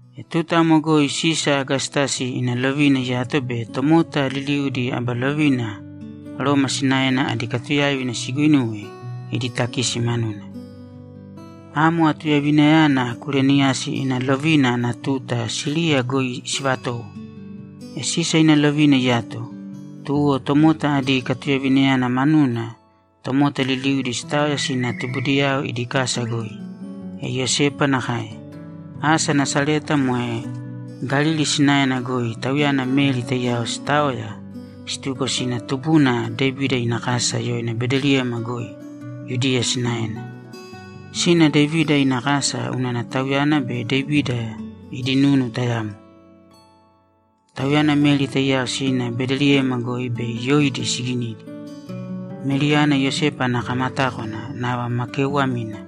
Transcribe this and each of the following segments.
E tuta amo goi Sisa Agastasi ina lovina iyato be tomota liliudi aba lovina Roma sinaena adi katuyáiva siguinuwe idi takisi manuna. Amo atuyaivinayana Kureniyasi ina lovina ana tuta Siriya goi sivatowo. E Sisa ina lovina iyato, tuwo tomota adi katuyaivayana manuna tomota liliudi sitaoya sina tubudiyao idi kasa goi. E Iyosepa nakae. Asa Nasareta moe Galili sinaena goi tauyana Meri taiyao sitaoya, situko sina tubuna Devida ina kasa yoina Bedeliyema goi, Yudiya sinaena. Sina Devida ina kasa unana tauyana be Devida adi nunu tayamo. Tauyana Meri taiyao sina Bedeliyema goi bei yoidi siginidi. Meriyana Iyosepa ana kamatákwana nava ma keeuwamina.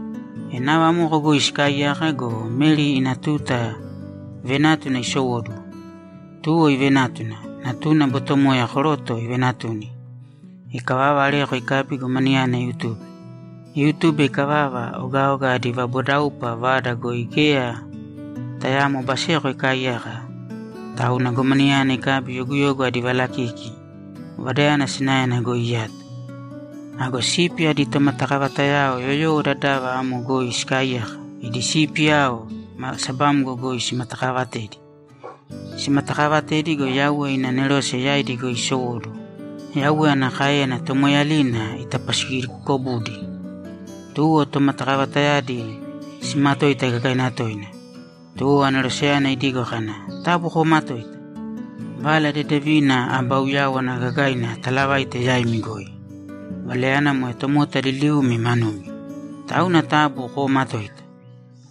E nava amoko goi sikaaiyaka go, Meri ina tuta venátuna isowóduwo. Tuwo ivenátuna, natuna botomoya koroto ivenatuni. Ikavava, areko ikabi, gomanayana iutube. Iutube ikavava, ogaoga adi vabodaupa vada goi geya tayaamo baseko ikaaiyaka, tauna gomanayana ikabi yoguyogu adi valakiki vadayana sinaena goi iyato. Ago sipi adi tomatakavatayao yoyowo dadava amo goi sikaaiyaka, idi sipiyao sabamgo goi simatakaavatedi. Simatakaavatedi go, Yauwe ina anerose yaidi goi isowóduwo, Yauwe ana káeyana tomoeeyalina itapasigikobudi. Tuwo tomatakavatayadi simatoita gagaina toina. Tuwo aneroseyana idigo kana, ‘Taabu koomatōita! Vala Dedevina aba uyáwana gagaina atalavaite yaimi goi. Valayana moe tomota liliumi manumi. Tauna taabu koomatōita!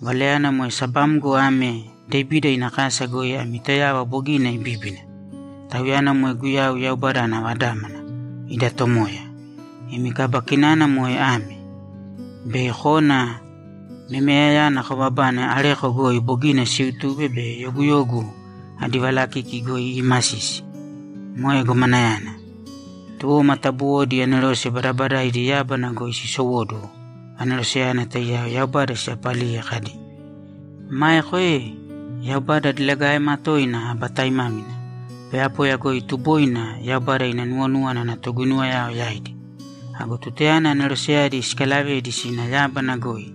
Valayana moe sabamgo ame Devida ina kasa goi ami Toyava bogina ibíbina. Tauyana moe Guyau, Yaubada ana Vadámana, ida Tomoya. Imi kaba kinana moe ame: Bei kona memeyayana kobabane areko goi bogina siutube be yoguyogu adi valakiki goi iimasisi. Moe gomanayana.’ Tuwo matabuwodi anerose badabadaaidi yábana goi sisowóduwo aneroseyana taiyao Yaubada siyaapaliye kadi, ‘Maeko ee, Yaubada diligaema toina aba taimámina! Poyapoya goi tuboina Yaubada ina nuwonúwana ana toguinuwayao yaidi.’ Ago tutayana aneroseyadi sikalavedi sina yábana goi,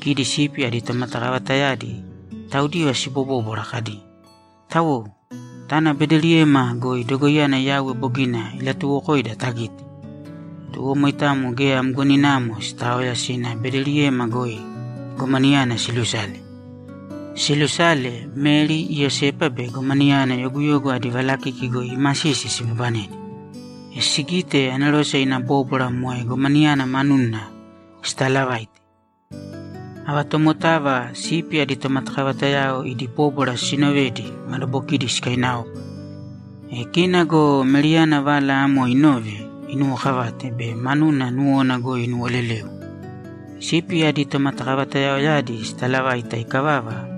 kidi sipi adi tomatakavatayadi taudiva sibobóbwara kadi, ‘Tawou, tāna Bedeliyema goi dogoiyana Yauwe bogina ilatuuwokoida tagīte.’ Tuwo moitamo geya mgoninamo sitaoya, sina Bedeliyema goi gomanayana silusale. Silusale, Meri, Iyosepa be gomanayana yoguyogu adi valakiki goi iimasisi sibabanedi. E sigite, anerose ina bóbwara moe gomanayana manuna sitalavaite. Ava tomotava sipi adi tomatakavatayao idi bóbwara sinovedi, madabokidi sikainaopa. E kina go Meriyana vala amo inove, inuwokavate be manuna nuwona goi inuwoleleu. Sipi adi tomatakavatayaoyadi sitalavaita ikavava,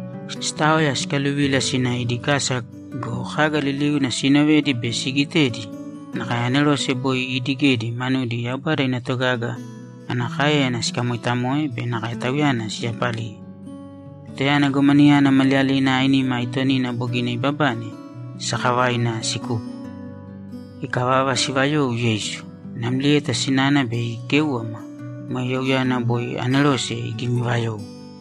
sitaoya sikaluvila sina idi kasa go, kaga liliuna siinovedi be siigitedi nakae anerose boi iidigedi manudi Yaubada ina togaga ana káeyana sikamoitamoe be nakae Tauyana siyapaliye. Tutayana gomanayana maliyalina ainima aitonina bogina ibabane, sakavaina sikupo. Ikavava, sivayou Yeisu. Namlieta sinana bei ikéuwama, moe youyana boi anerose igimivayou.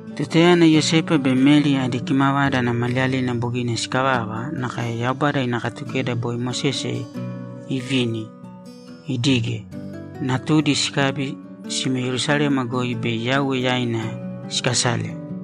Tutayana Iyosepa be Meri adi kimavada ana maliyalina bogina sikavava nakae Yaubada ina Katukeda boi Mosese ivini idige, natudi sikabi sime Yerusalema goi bei Yauwe yaina sikasale.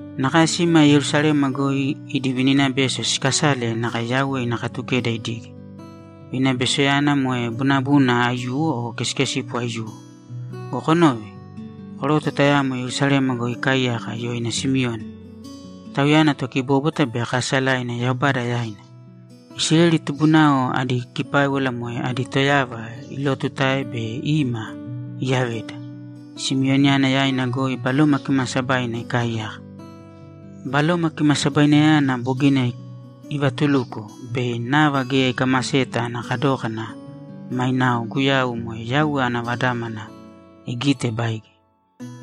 Nakae sima Yerusalema goi idi vininabeso sikasale nakae Yauwe ina Katukeda idige. Vininabesoyana moe bunabuna aiyuwo o kesikesipo aiyuwo. Go konōve! Koroto tayamo Yerusalema goi ikaaiyaka yoina Simioni. Tauyana tokibóbwata be kaasalaina Yaubada yaina. Isileli tubunao adi kipáiwala moe adi Toyava ilootutae bei ima iyavedi. Simioniyana yaina goi Baloma Kimaasabaina ikaaiyaka. Baloma Kimasabainayana bogina ivatuluko bei nava geya ikamaseta ana kadókana mainao Guyau, moe Yauwe ana Vadámana, igite baige.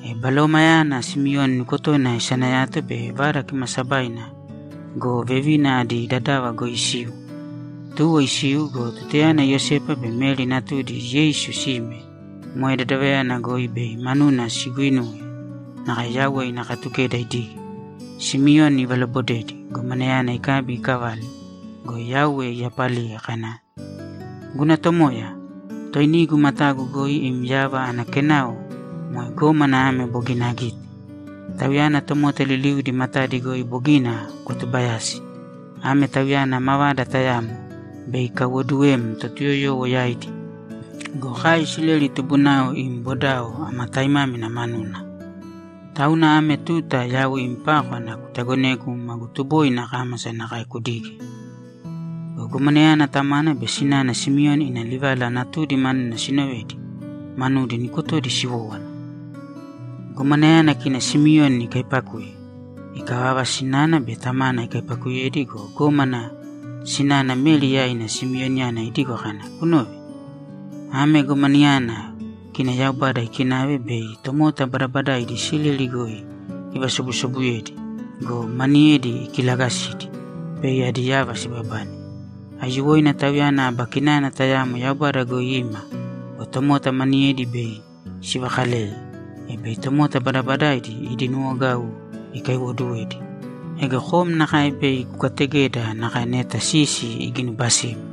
E Balomayana Simioni nukotona isanayato be Vada Kimaasabaina go, vevina adi dadava goi isiu. Tuwo isiu go, tutayana Iyosepa be Meri natudi Yeisu sime moe dadavayana goi bei manuna siguinuwe nakae Yauwe ina Katukeda idige, Simioni ivalobodedi, gomanayana ikabi ikavale go, Yaubada iyapaliye kana, ‘Guna Tomoya, Toinigu matagu goi im yava ana kenao moe gómana ame bogina agite. Tauyana tomota liliudi matadi goi bogina kwatubayasi. Ame Tauyana mavada tayamo bei ikaiwoduwem Totuyoyowo yaidi go, kai Isileli tubunao im bodao ama taimámina manuna. Tauna ame tuta yau im pákwana kutagonēgu magu tuboina akámasa nakae kudige.’ Go gomanayana tamana be sinana Simioni ina livala natudi manuna sinovedi, manudi nukotodi siwowówana. Gomanayana kina Simioni ikaipakuye. Ikavava, sinana be tamana ikaipakuyedi go, gómana sinana Meri yaina Simioniyana idigo kana, ‘Kunōve. Ame gomanayana kina Yaubada ikinave bei tomota badabadaidi Isileli goi ivasobusobuyedi go, maniyedi ikilagasidi bei adi yava sibabane. Aiyuwoina Tauyana aba kinana tayamo Yaubada goi ima go, tomota maniyedi bei sivakaleye, e bei tomota badabadaidi idi nuwogau ikaiwoduwedi. Ego kom nakae bei kukategeda nakae neta sisi iginubasim.’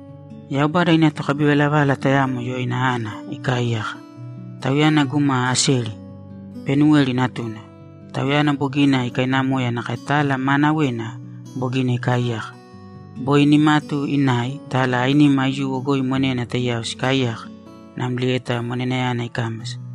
Yaubada ina tokabivalavala tayamo yoina Ana ikaaiyaka. Tauyana guma Aseri; Panuweli natuna. Tauyana bogina ikainamoya nakae tala maanawena bogina ikaaiyaka. Boi nimatu inai, tala ainima aiyuwo goi monena taiyao sikaaiyaka namlieta monenayana ikámasa.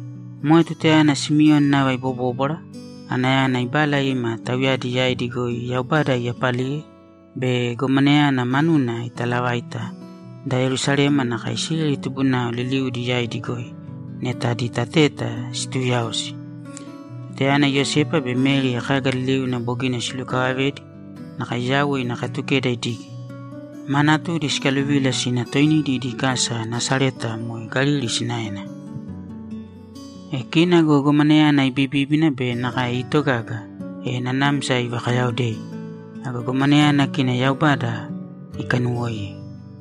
Moe tutayana Simioni nava ibobóbwara, Anayana ibala ima tauyadi yaidi goi Yaubada iyapaliye be gomanayana manuna itaalavaita da Yerusalema nakae Isileli tubunao liliudi yaidi goi neta adi tateta situuyaosi. Tutayana Iyosepa be Meri kaga liliuna bogina silukavavedi nakae Yauwe ina Katukeda idige, ma natudi sikaluvila sina toinidi idi kasa Nasareta moe Galili sinaena. E kina go gomanayana ibibíbina be nakae iitogaga, e nanamsa ivakayaaodei. Ago gomanayana kina Yaubada ikanuwoiye.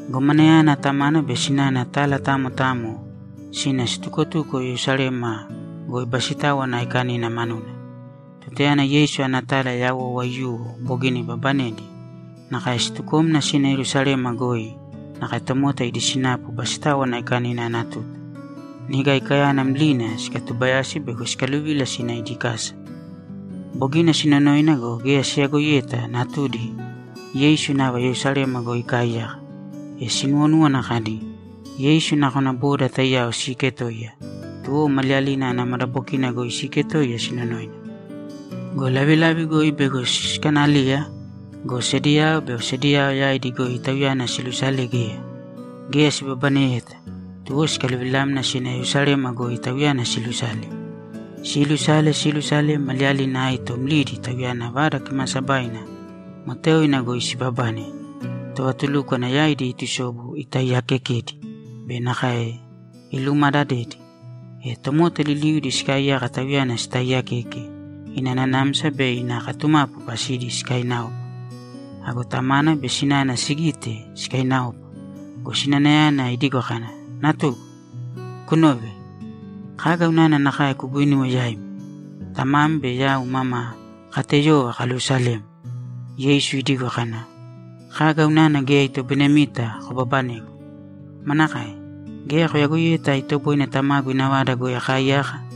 Gomanayana tamana be sinana tala tamo tamo sina situkotuko Yerusalema goi Basitáwana Aikanina manuna. Tutayana Yeisu ana tala yawou aiyuwo bogina ibabanedi, nakae situkomna sina Yerusalema goi nakae tomota idi sinapu Basitáwana Aikanina ana tuta. Niga Aikayana mlina sikatubayasi bego sikaluvila sina idi kasa. Bogina sinonoina go, geya siyagoiyeta natudi Yeisu nava Yerusalema goi ikaaiyaka. E sinuwonúwana kadi, ‘Yeisu nakona boda taiyao siiketoiya’, tuwo maliyalina ana madabokina goi siiketoiya sinonoina. Go lavilavi goi bego sikanaliya go, sediyao be osediyao yaidi goi Tauyana siilusale, geya. Geya sibabaneyeta, tuwo sikaluvilamna sina Yerusalema goi Tauyana siilusale. Siilusale, siilusale, maliyalina aito mlidi Tauyana Vada Kimaasabaina moteoina goi sibabane, tovatulúkwana yaidi iitusobu, itaiyaakekedi be nakae ilumaadadedi. E tomota liliudi sikaaiyaka Tauyana sitaaiyakeke, ina nanamsa be ina katumapu pasidi sikainaopa. Ago tamana be sinana sigite, sikainaopa go, sinanayana idigo kana, ‘Natugu, kunōve. Kaga unana nakae kuguinuwe yaima? Tamam be yau mama kateyova kaluusalem.’ Yeisu idigo kana, ‘Kaga unana geya itoboinemita kobabanegu? Manakae? Geya koyagoiyeta itoboine Tamagu ina vada goi akaaiyaka?’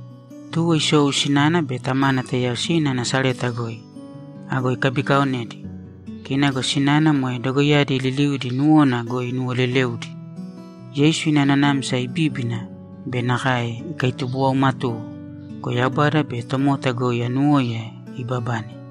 Tuwo isou sinana be tamana taiyao sina Nasareta goi. Ago ikabikaaonedi. Kina go sinana moe dogoiyadi liliudi nuwona goi inuwooleleudi. Yeisu ina nanamsa ibíbina be nakae ikaitubuwaumatuwo go, Yaubada be tomota goi anuwóiya ibabane.